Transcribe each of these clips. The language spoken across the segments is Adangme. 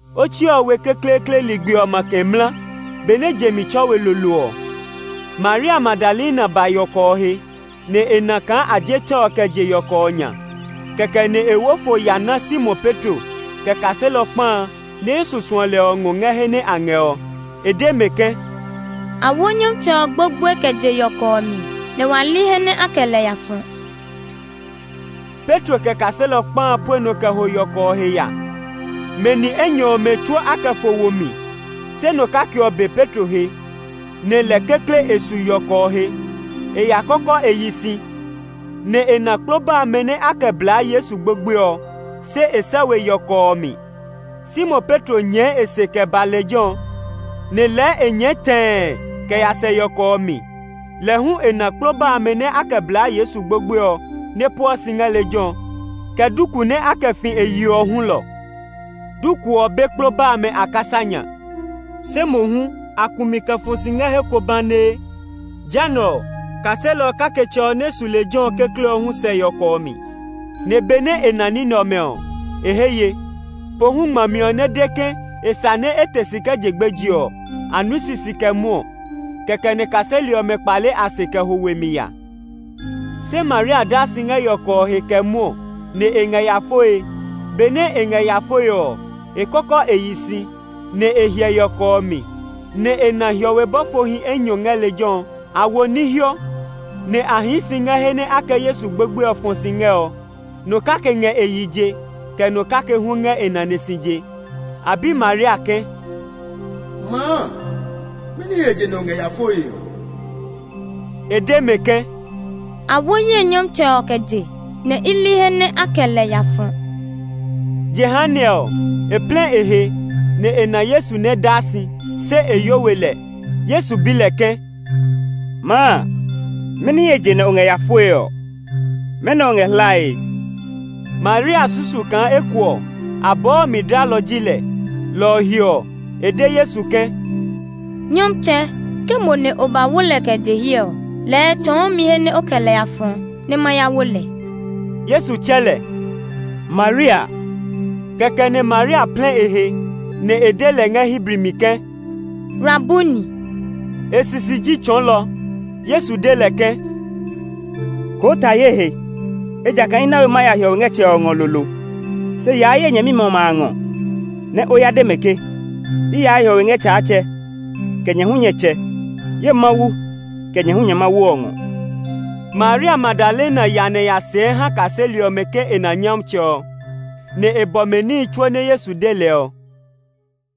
Otsi ɔ we kekleekle ligbi ɔ makɛ mla, benɛ je mi tsɔ we lolo ɔ, Maria Magdalena ba yɔkɔ ɔ he, nɛ e na kaa a je tɛ ɔ kɛ je yɔkɔ ɔ nya. Kɛkɛ nɛ e wo fo kɛ ya na Simon Petro, kɛ kaselɔ kpa a nɛ Yesu suɔ lɛ ɔ ngɛ he nɛ a ngɛ ɔ. E de mɛ ke, “A wo Nyɔmtsɛ ɔ gbogboe kɛ je yɔkɔ ɔ mi, nɛ wa li he nɛ a kɛ lɛ ya fɔ.” Petro kɛ kaselɔ kpa a pue nɔ kɛ ho yɔkɔ ɔ he ya. Mɛ ni enyɔ ɔmɛ tsuo a kɛ fo wo mi, se nɔ kake ɔ be Petro he, nɛ lɛ kekle e su yɔkɔ ɔ he. E ya kɔkɔ e yi si, nɛ e na kploba amɛ nɛ a kɛ bla Yesu gbogboe ɔ, se e sɛ we yɔkɔ ɔ mi. Simon Petro nyɛɛ e se kɛ ba lejɛ ɔ, nɛ lɛɛ e nyɛɛ tɛɛ kɛ ya sɛ yɔkɔ ɔ mi. Lɛ hu e na kploba amɛ nɛ a kɛ bla Yesu gbogboe ɔ nɛ pueɔ si ngɛ lejɛ ɔ, kɛ duku nɛ a kɛ fi e yi ɔ hulɔ. Duku ɔ be kploba amɛ a kasa nya; se mohu a ku mi kɛ fɔ si ngɛ he ko banee. Jehanɛ ɔ, kaselɔ kaketsɛ ɔ nɛ su lejɛ ɔ kekle ɔ hu sɛ yɔkɔ ɔ mi; nɛ benɛ e na ní nɛ ɔmɛ ɔ, e he ye. Pohu ngmami ɔ nɛ de ke e sa nɛ e te si kɛ je gbeje ɔ, a nui sisi kɛ mwɔɔ. Kɛkɛ nɛ kaseli ɔmɛ kpale a se kɛ ho we mi ya. Se Maria daa si ngɛ yɔkɔ ɔ he kɛ mwɔɔ, nɛ e ngɛ ya foe. Benɛ e ngɛ ya foe ɔ, e kɔkɔ e yi si, nɛ e hyɛ yɔkɔ ɔ mi, nɛ e na hiɔwe bɔfohi enyɔ ngɛ lejɛ ɔ. A wo ní hiɔ, nɛ a hii si ngɛ he nɛ a kɛ Yesu gbogboe ɔ fɔ si ngɛ ɔ; nɔ kake ngɛ e yi je, kɛ nɔ kake hu ngɛ e nane si je. A bi Maria ke, “Maa, mɛni he je nɛ o ngɛ ya foe ɔ?” E de mɛ ke, “A wo ye Nyɔmtsɛ ɔ kɛ je, nɛ i li he nɛ a kɛ lɛ ya fɔ.” Jehanɛ ɔ, e plɛ e he, nɛ e na Yesu nɛ daa si, se e yo we lɛ. Yesu bi lɛ ke, “Maa, mɛni he je nɛ o ngɛ ya foe ɔ? Mɛnɔ o ngɛ hlae?” Maria susu kaa eko ɔ, abɔɔ ɔ mi dlalɔ ji lɛ, lɔ ɔ he ɔ, e de Yesu ke, “Nyɔmtsɛ, ke mo nɛ o ba wo lɛ kɛ je hiɛ ɔ, lɛɛ tsɔɔ mi he nɛ o kɛ lɛ ya fɔ nɛ ma ya wo lɛ.” Yesu tsɛ lɛ, “Maria!” Kɛkɛ nɛ Maria plɛ e he, nɛ e de lɛ ngɛ Hebri mi ke, “Rabuni” (E sisi ji “Tsɔɔlɔ”). Yesu de lɛ ke, “Koo ta ye he, ejakaa i na we ma ya hiɔwe ngɛ Tsɛ ɔ ngɔ lolo. Se yaa ye nyɛmimɛ ɔmɛ a ngɔ, nɛ o ya de mɛ ke, ‘I yaa hiɔwe ngɛ Tsaatsɛ, kɛ nyɛ hu nyɛ Tsɛ; ye Mawu, kɛ nyɛ hu nyɛ Mawu ɔ ngɔ.’” Maria Magdalena ya nɛ e ya sɛɛ ha kaseli ɔmɛ ke e na Nyɔmtsɛ ɔ, nɛ e bɔ mɛ níhi tsuo nɛ Yesu de lɛ ɔ.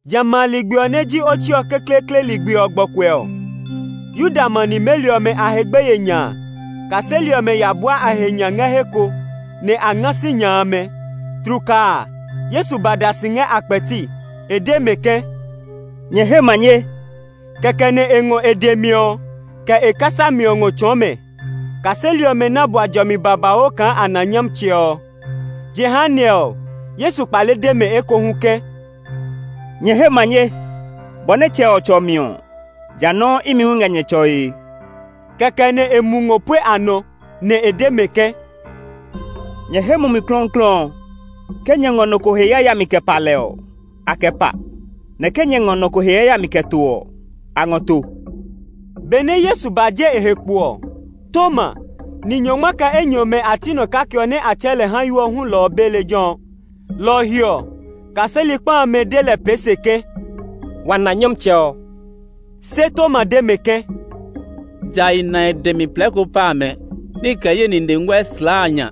Jamɛ a ligbi ɔ nɛ ji otsi ɔ kekleekle ligbi ɔ gbɔkuɛ ɔ, Yuda ma nimeli ɔmɛ a he gbeye nya a, kaseli ɔmɛ ya bua a he nya ngɛ he ko, nɛ a nga sinya amɛ. Tlukaa a, Yesu ba da si ngɛ a kpɛti. E de mɛ ke, “Nyɛ he manye!” Kɛkɛ nɛ e ngɔ e dɛ mi ɔ, kɛ e kasa mi ɔ ngɔ tsɔɔ mɛ. Kaseli ɔmɛ ná bua jɔmi babauu kaa a na Nyɔmtsɛ ɔ. Jehanɛ ɔ, Yesu kpale de mɛ ekohu ke, “Nyɛ he manye! Bɔ nɛ Tsɛ ɔ tsɔ mi ɔ, ja nɔuu imi hu i ngɛ nyɛ tsɔe.” Kɛkɛ nɛ e mu ngɔ pue a nɔ, nɛ e de mɛ ke, “Nyɛ he Mumi Klɔuklɔu ɔ. Ke nyɛ ngɔ nɔ ko he yayami kɛ pa lɛ ɔ, a kɛ pa; nɛ ke nyɛ ngɔ nɔ ko he yayami kɛ to ɔ, a ngɔ to.” Benɛ Yesu ba je e he kpo ɔ, Toma, ni nyɔngma kɛ enyɔ ɔmɛ a ti nɔ kake nɛ a tsɛɛ lɛ Hayo hulɔ ɔ be lejɛ ɔ. Lɔ ɔ he ɔ, kaseli kpa amɛ de lɛ pee se ke, “Wa na Nyɔmtsɛ ɔ!” Se Toma de mɛ ke, “Ja i na e dɛ mi plɛɛko pa amɛ nɛ i kɛ ye nine nguɛ slaa a nya,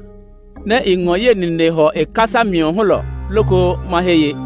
nɛ i ngɔ ye nine hɔ e kasa mi ɔ hulɔ loko ma he ye.”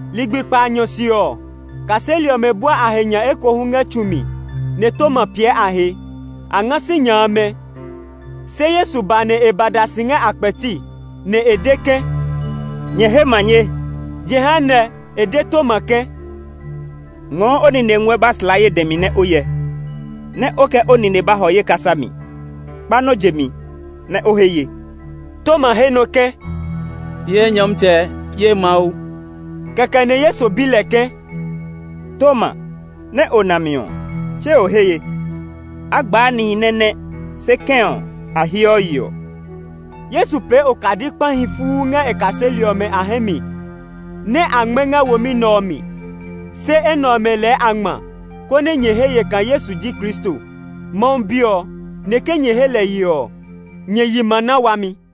Ligbi kpaanyɔ se ɔ, kaseli ɔmɛ bua a he nya ekohu ngɛ tsu mi, nɛ Toma piɛ a he. A nga sinya amɛ, se Yesu ba nɛ e ba da si ngɛ a kpɛti, nɛ e de ke, “Nyɛ he manye!” Jehanɛ, e de Toma ke, “Ngɔɔ o nine nguɛ ba slaa ye dɛ mi nɛ o hyɛ; nɛ o kɛ o nine ba hɔ ye kasa mi. Kpa nɔ jemi, nɛ o he ye!” Toma he nɔ ke, “Ye Nyɔmtsɛ! Ye Mawu!” Kɛkɛ nɛ Yesu bi lɛ ke, “Toma, nɛ o na mi ɔ, tse o he ye? A gbaa nihi nɛ nɛ́, se kɛ̃ ɔ, a heɔ yeɔ!” Yesu pee okadi kpahi fuu ngɛ e kaseli ɔmɛ a hɛ mi nɛ a ngmɛ́ ngɛ womi nɛ ɔ mi. Se enɛ ɔmɛ lɛɛ a ngma, konɛ nyɛ he ye kaa Yesu ji Kristo, Mawu Bi ɔ. Nɛ ke nyɛ he lɛ ye ɔ, nyɛ yi ma na wami.